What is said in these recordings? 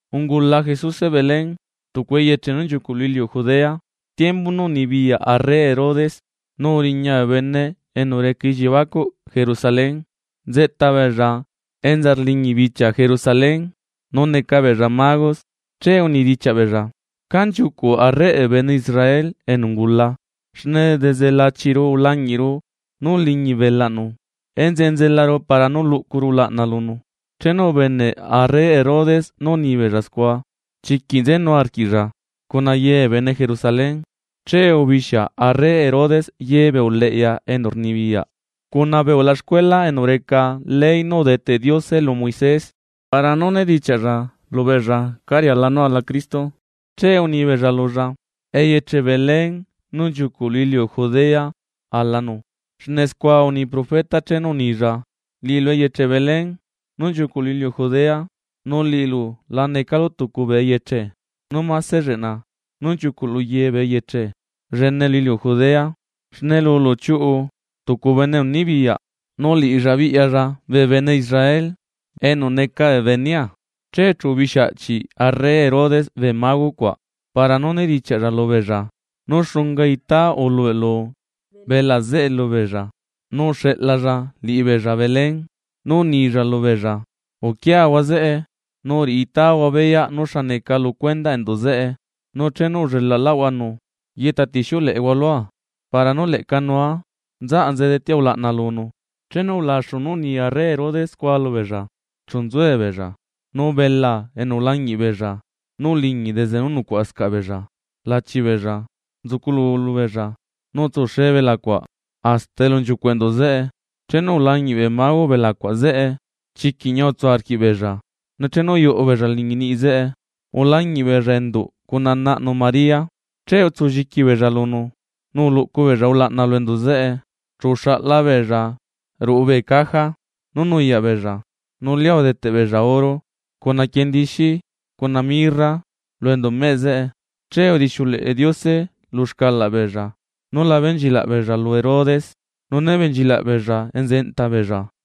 Ungula Jesuse Belén, tucu eyeche nú nchiucuꞌ lu iliu Judea, tiembu nú unibiyaꞌ arre Herodes. Nu uriña bee bene enu reca elliebacuꞌ Jerusalén, nzeꞌta beella enza rliñi bichia Jerusalén nu neca beella magos, che unidichiaꞌ beella: ―¿Cá nchiucuꞌ arreꞌ bee bene Israel enu ungula? Xne desde lachiru ulañiꞌlaꞌru nú uliñi belaꞌnu, enzeꞌe nzelaru para nú luꞌcuru ulaꞌna lunu. Chenu ubeneꞌ arre Herodes nú unibeella scua, chiquiꞌ nzenu arquiꞌlla, cuna ye bee bene Jerusalén. Che ubixia arre Herodes ye bee uleꞌya enu rnibiyaꞌ, cuna bee ulaxcuela enu reca ley nú udeteꞌ Diose lu Moisés para nú nedichiaꞌlla lubeella cá riala nú ala Cristo. Che uni beella lulla: ―Eyeche Belén nú nchiucuꞌ lu iliu Judea alanu, xne scua uni profeta chenu unilla: Liꞌilu eyeche Belén nú nchiucuꞌ lu iliu Judea, nu liꞌilu la necalu tucu bee eyeche nú mase lleꞌna nú nchiucuꞌ lu ye bee eyeche llene lu iliu Judea. Xne lulu chiuꞌu tucu bene enu nibiyaꞌ, nu liꞌilla biꞌyalla bee bene Israel enu neca bee benea. Che chu ubixia aꞌchi arre Herodes bee mago cuaꞌ para nú unedichiaꞌlla lubeella nú xunga itáa ulubeꞌlu belaa zeꞌe lubeella. Nu uxeꞌlalla liꞌibeella Belén, nú unilla lubeella: ―Uquiahua zeꞌe, nu riꞌi itáahua beyaꞌ nú xa neca lu cuendaꞌ enduꞌ zeꞌe. Nu chenu ullelaꞌlaꞌhuanu, yeꞌta tixiuleꞌehua lua para nú leꞌca nua nzaꞌa nze detea ulaꞌna lunu. Chenu ulaxu nú uni arre Herodes scua lubeella, chu nzuebeella. Nu belaa enu ulañiꞌ beella nú uliñi desde nú nucuaꞌascaꞌ beella lachi beella nzuculu lubeella, nu utsuxe belaa cuaꞌ hasta elu nchiucuꞌ enduꞌ zeꞌe. Chenu ulañiꞌ bee mago belaa cuaꞌ zeꞌe, chiquiꞌ ñia utsu arquiꞌbeella, nu chenu uyuꞌu beella liñi niꞌi zeꞌe, ulañiꞌ beella enduꞌ cuna naꞌnu María, che utsulliqui beella lunu nu uluꞌcu beella ulaꞌna lu enduꞌ zeꞌe. Chu uxaꞌla beella ruꞌu bee caja nú nuyaꞌ beella nu lia udeteꞌ beella oro, cuna quiendixi, cuna mirra lu enduꞌ meꞌ zeꞌe. Che udixiuleꞌe Diose lu xcalaꞌ beella nula benchilaꞌ beella lu Herodes, nu né benchilaꞌ beella enza enta beella.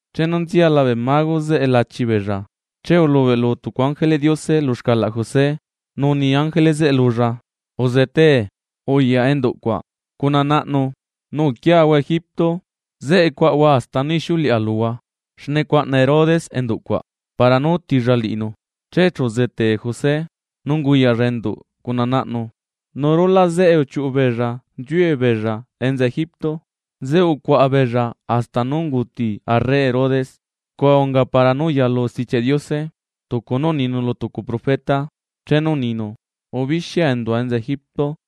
Chenu nziala bee mago zeꞌe lachi beella, che ulubeꞌlu tucu ángeleꞌ Diose lu xcalaꞌ José, nu uni ángele zeꞌe lulla: ―Uzetee, uyaꞌ enduꞌ cuaꞌ cuna naꞌnu nu uquiahua Egipto, zeꞌe cuaꞌahua hasta nú ixiuleꞌa luhua. Xne cuaꞌna Herodes enduꞌcuaꞌ para nú utilla liꞌinu. Che chu uzete José, nu unguyaꞌlla enduꞌ cuna naꞌnu, nu rulaꞌ zeꞌe uchiuꞌu beella nziue beella enza Egipto. Zeꞌe ucuaꞌa beella hasta nú unguti arre Herodes. Scua unga para nú uyalu Stichiaꞌ Diose tucu nú uninu lu tucu profeta chenu uninu: “Ubixia endua enza Egipto.”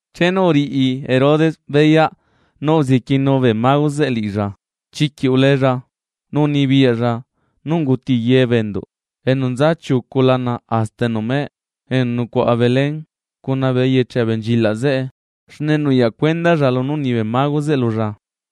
Chenu uriꞌi Herodes beyaꞌ nú uzequienu bee mago zeꞌe liꞌilla, chiquiꞌ uleella, nu unibiyaꞌlla nú unguti ye bee enduꞌ enu nza chiucu lana hasta enu meꞌe enu nucuaꞌa Belén cuna bee eyeche abenchilaꞌ zeꞌe, xne nuyaꞌ cuendalla lunú uni bee mago zeꞌe lulla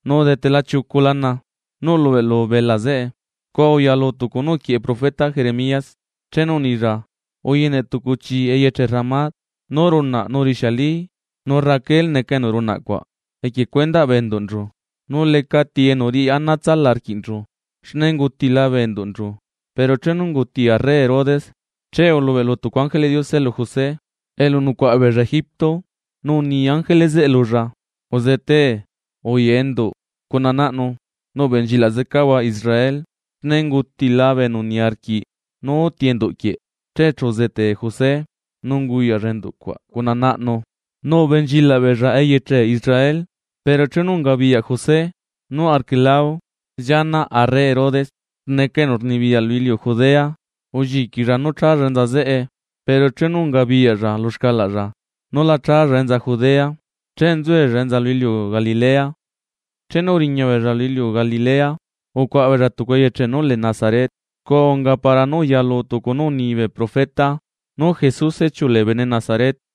nu udetela chiucu lana nú ulubeꞌlu belaa zeꞌe. Scua uyalu tucu nú uquieꞌe profeta Jeremías chenu unilla: Uyene tucu chii eyeche Ramá, nú runaꞌ nu rixiali. Nu Raquel neca enu runaꞌ cuaꞌ equie cuendaꞌ bee enduꞌnchu, nu lecati enu riꞌi ana tsala arquiꞌnchu xne ungutila bee enduꞌnchu. Pero chenu unguti arre Herodes, che ulubeꞌlu tucu ángeleꞌ Diose lu José elu nucuaꞌa beella Egipto nu uni ángele zeꞌe lulla: ―Uzetee, uyaꞌ enduꞌ cuna naꞌnu, nu ubenchilaꞌ zecahua Israel xne ungutila bee enu niarquiꞌ nú uti enduꞌ quieꞌ. Che chu uzetee José nu unguyaꞌlla enduꞌ cuaꞌ cuna naꞌnu nu ubenchilaꞌ beella eyeche Israel. Pero chenu ungabiyaꞌ José nú Arquelao llianaꞌ arre Herodes neca enu rnibiyaꞌ lu iliu Judea, ulliquilla nú challa enza zeꞌe. Pero chenu ungabiyaꞌlla lu xcalaꞌlla nú la challa enza Judea, che nzuella enza lu iliu Galilea. Chenu uriña beella lu iliu Galilea, ucuaꞌa beella tucu eyeche nú lee Nazaret. Scua unga para nú uyalu tucu nú uni bee profeta nú Jesuse chiulee bene Nazaret.